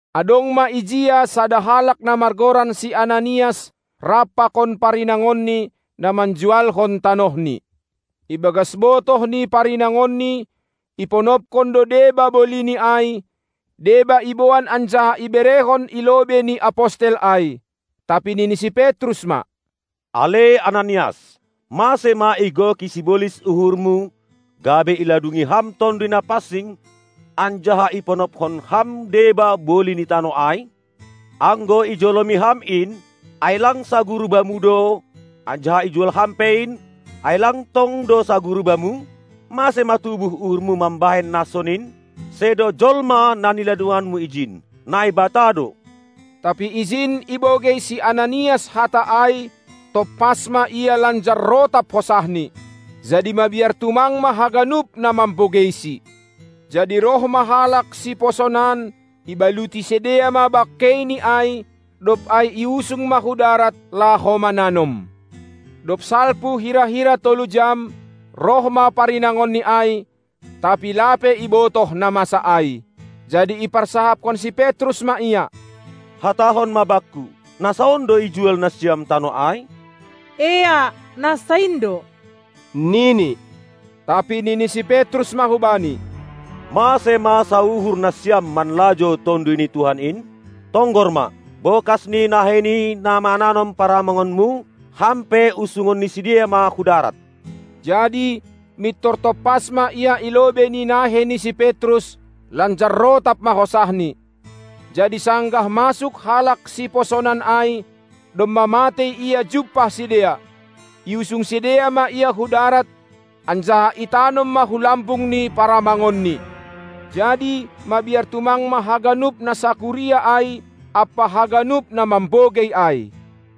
Adong ma ijia sada halak na margoran si Ananias, rap pakon parinangonni, na manjualhon tanohni. Ibagas botoh ni parinangonni, iponopkon do deba bolini ai, deba iboan anjaha iberehon i lobei ni apostel ai. Tapi nini si Petrus ma: Ale Ananias, mase ma igoki sibolis uhurmu, gabe iladungi ham Tonduy Napansing, anjaha iponophon ham deba boli ni tanoh ai? Anggo ijolomi ham in, ai lang saguru bamu do, anjaha ijual ham pe in, ai lang tong do saguru bamu? Mase ma tubuh uhurmu mambahen na sonin? Sedo jolma na niladunganmu ijin, Naibata do! Tapi ijin ibogei si Ananias hata ai, tompas ma ia lanjar rotap hosahni. Jadi mabiar tumang ma haganup na mambogeisi. Jadi roh ma halak siposonan, ibaluti sidea ma bangkeini ai, dob ai iusung ma hu darat laho mananom. Dob salpu hira-hira tolu jam roh ma parinangonni ai, tapi lape ibotoh na masa ai. Jadi iparsahapkon si Petrus ma ia: Hatahon ma bakku, na sa on do ijual nasiam tanoh ai? Eak, na sa in do, nini. Tapi nini si Petrus ma hubani: Mase ma sauhur nasiam manlajou Tonduy ni Tuhan in? Tonggor ma, bokas ni nahei ni na mananom paramangonmu, ham pe usungon ni sidea ma hu darat! Jadi mintor tompas ma ia i lobei ni nahei ni si Petrus, lanjar rotap ma hosahni. Jadi sanggah masuk halak siposonan ai, domma matei ia jumpah sidea, iusung sidea ma ia hu darat, anjaha itanom ma hu lambung ni paramangonni. Jadi mabiar tumang ma haganup na sakuria ai ampa haganup na mambogei ai.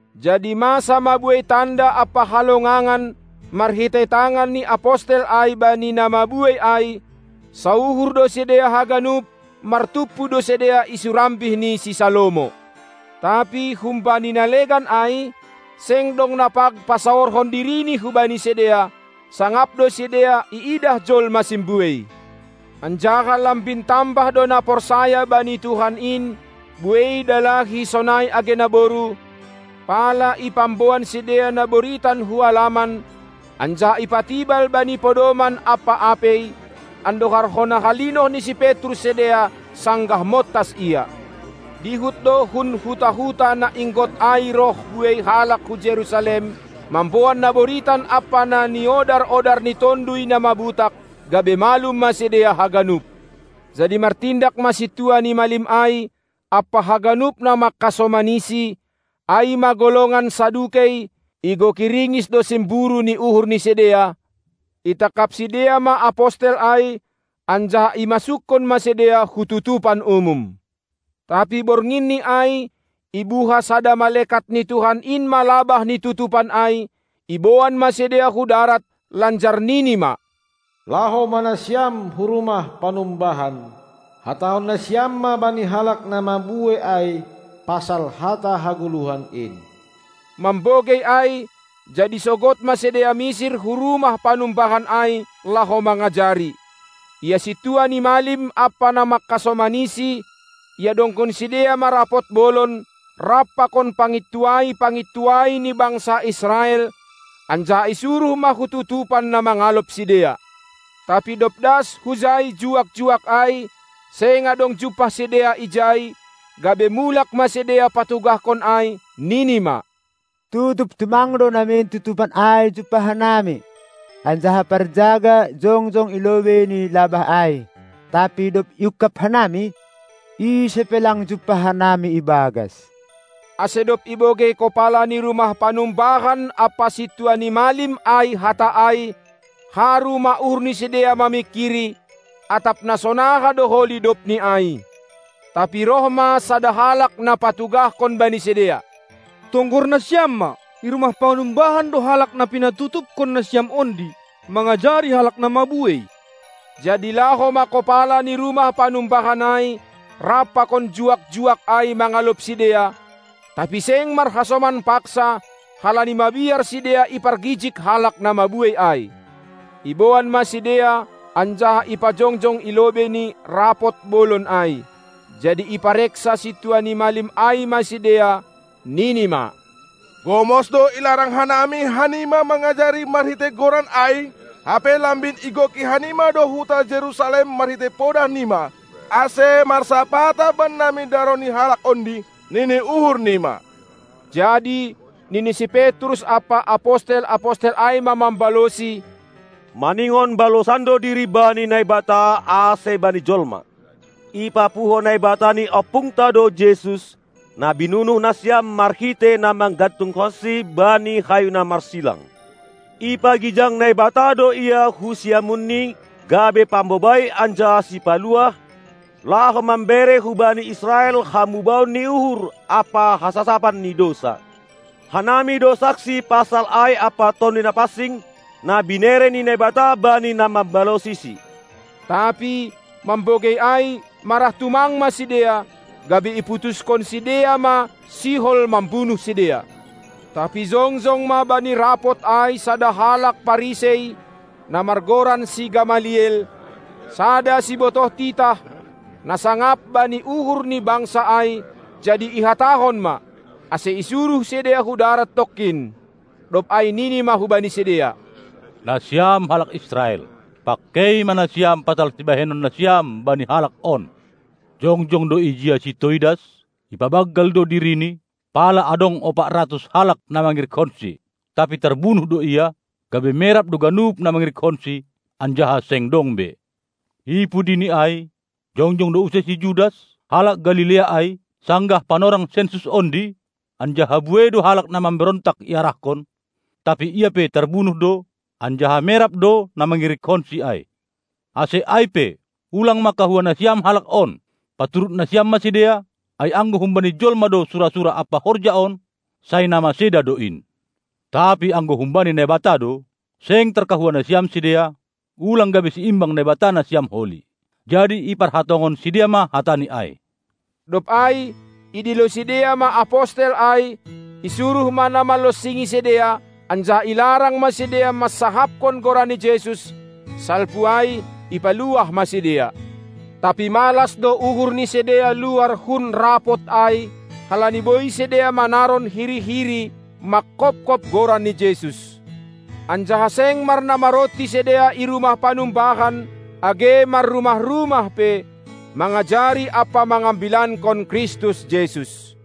Jadi masa ma buei tanda ampa halongangan marhitei tangan ni apostel ai bani na mabuei ai; sauhur do sidea haganup, martumpu do sidea i surambih ni si Salomo. Tapi humbani na legan ai, seng dong na pag pasaorhon dirini hubani sidea; sangap do sidea iidah jolma simbuei. Anjaha lambin tambah do na porsaya bani Tuhan in, buei dalahi sonai age naboru, pala ipamboan sidea na boritan hu alaman, anjaha ipatibal bani podoman ampa apei, andohar hona halinoh ni si Petrus sidea sanggah montas ia. Dihut do hun huta-huta na inggot ai roh buei halak hu Jerusalem, mamboan na boritan ampa na niodar-odar ni tonduy na mabutak, gabe malum ma sidea haganup. Jadi martindak ma sintua ni malim ai ampa haganup na mangkasomanisi, ai ma golongan Sadukei, igoki ringis do simburu ni uhur ni sidea, itangkap sidea ma apostel ai anjaha imasukkon ma sidea hu tutupan umum. Tapi bornginni ai, ibuha sada malekat ni Tuhan in ma labah ni tutupan ai, iboan ma sidea hu darat lanjar nini ma: Laho ma nasiam hu rumah panumbahan, hatahon nasiam ma bani halak na mabuei ai pasal hata hagoluhan in! Mambogei ai, jadi sogod ma sidea misir hu rumah panumbahan ai laho mangajari. Ia sintua ni malim ampa na mangkasomanisi, iadongkon sidea ma rapot bolon rap pakon pangintuai-pangintuai ni bangsa Israel, anjaha isuruh ma hu tutupan na mangalop sidea. Tapi dob das hujai juak-juak ai, seng adong jumpah sidea ijai, gabe mulak ma sidea patugahkon ai, nini ma: Tutup tumang do namin tutupan ai jumpah hanami, anjaha parjaga jongjong i lobei ni labah ai; tapi dob iungkab hanami, ise pe lang jumpah hanami i bagas. Ase dob ibogei kopala ni rumah panumbahan ampa sintua ni malim ai hata ai, haru ma uhur ni sidea mamingkiri, atap na sonaha do holi dobni ai. Tapi roh ma sada halak na patugahkon bani sidea: Tonggor nasiam ma, i rumah panumbahan do halak na pinatutupkon nasiam ondi mangajari halak na mabuei! Jadi laho ma kopala ni rumah panumbahan ai rap pakon juak-juak ai mangalop sidea, tapi seng marhasoman paksa, halani mabiar sidea ipargijig halak na mabuei ai. Iboan ma sidea anjaha ipajongjong i lobei ni Rapot Bolon ai. Jadi ipareksa sintua ni malim ai ma sidea, nini ma: Gomos do ilarang hanami hanima mangajari marhitei Goran ai, hape lambin igoki hanima do huta Jerusalem marhitei podah nima, ase marsapata bannami daroh ni Halak ondi, nini uhur nima. Jadi nini si Petrus ampa apostel-apostel ai ma mambalosi: Maningon balosan do diri bani Naibata ase bani jolma! Ipapuho Naibata ni ompungta do Jesus, na binunuh nasiam marhitei na manggantungkonsi bani hayu na marsilang. Ipagijang Naibata do Ia hu siamunNi gabe Pambobai anjaha Sipaluah, laho mambere hubani Israel hamubahon ni uhur ampa hasasapan ni dousa. Hanami do saksi pasal ai ampa Tonduy Napansing, na binere ni Naibata bani na mambalosiSi. Tapi mambogei ai marah tumang ma sidea, gabe iputushon sidea ma sihol mambunuh sidea. Tapi jongjong ma bani rapot ai sada halak Parisei, na margoran si Gamaliel, sada sibotoh titah, na sangap bani uhur ni bangsa ai, jadi ihatahon ma, ase isuruh sidea hu darat tongkin. Dob ai nini ma hubani sidea: Nasiam halak Israel, pangkei ma nasiam pasal sibahenon nasiam bani halak on! Jongjong do ijia si Toidas, ipabanggal do dirini, pala adong ompat ratus halak na mangirikkonsi. Tapi tarbunuh do ia, gabe merap do ganup na mangirikkonsi, anjaha seng dong be. I pudini ai, jongjong do use si Judas, halak Galilea ai, sanggah panorang sensus ondi, anjaha buei do halak na mamberontak iarahkon; tapi ia pe tarbunuh do, anjaha merap do na mangirikkonsi ai. Ase ai pe, ulang ma kahua nasiam halak on, paturut nasiam ma sidea, ai anggo humbani jolma do sura-sura ampa horja on, sai na maseda do in. Tapi anggo humbani Naibata do, seng tarkahua nasiam sidea, ulang gabe siimbang Naibata nasiam holi. Jadi iparhatongon sidea ma hatani ai. Dob ai idilo sidea ma apostel ai; isuruh ma na manlonsingi sidea anjaha ilarang ma sidea mansahapkon Goran ni Jesus; salpu ai ipaluah ma sidea. Tapi malas do uhur ni sidea luar hun rapot ai, halani boi sidea manaron hiri-hiri mangkopkop Goran ni Jesus. Anjaha seng marnamaronti sidea i rumah panumbahan age marrumah-rumah pe, mangajari ampa mangambilankon Kristus Jesus.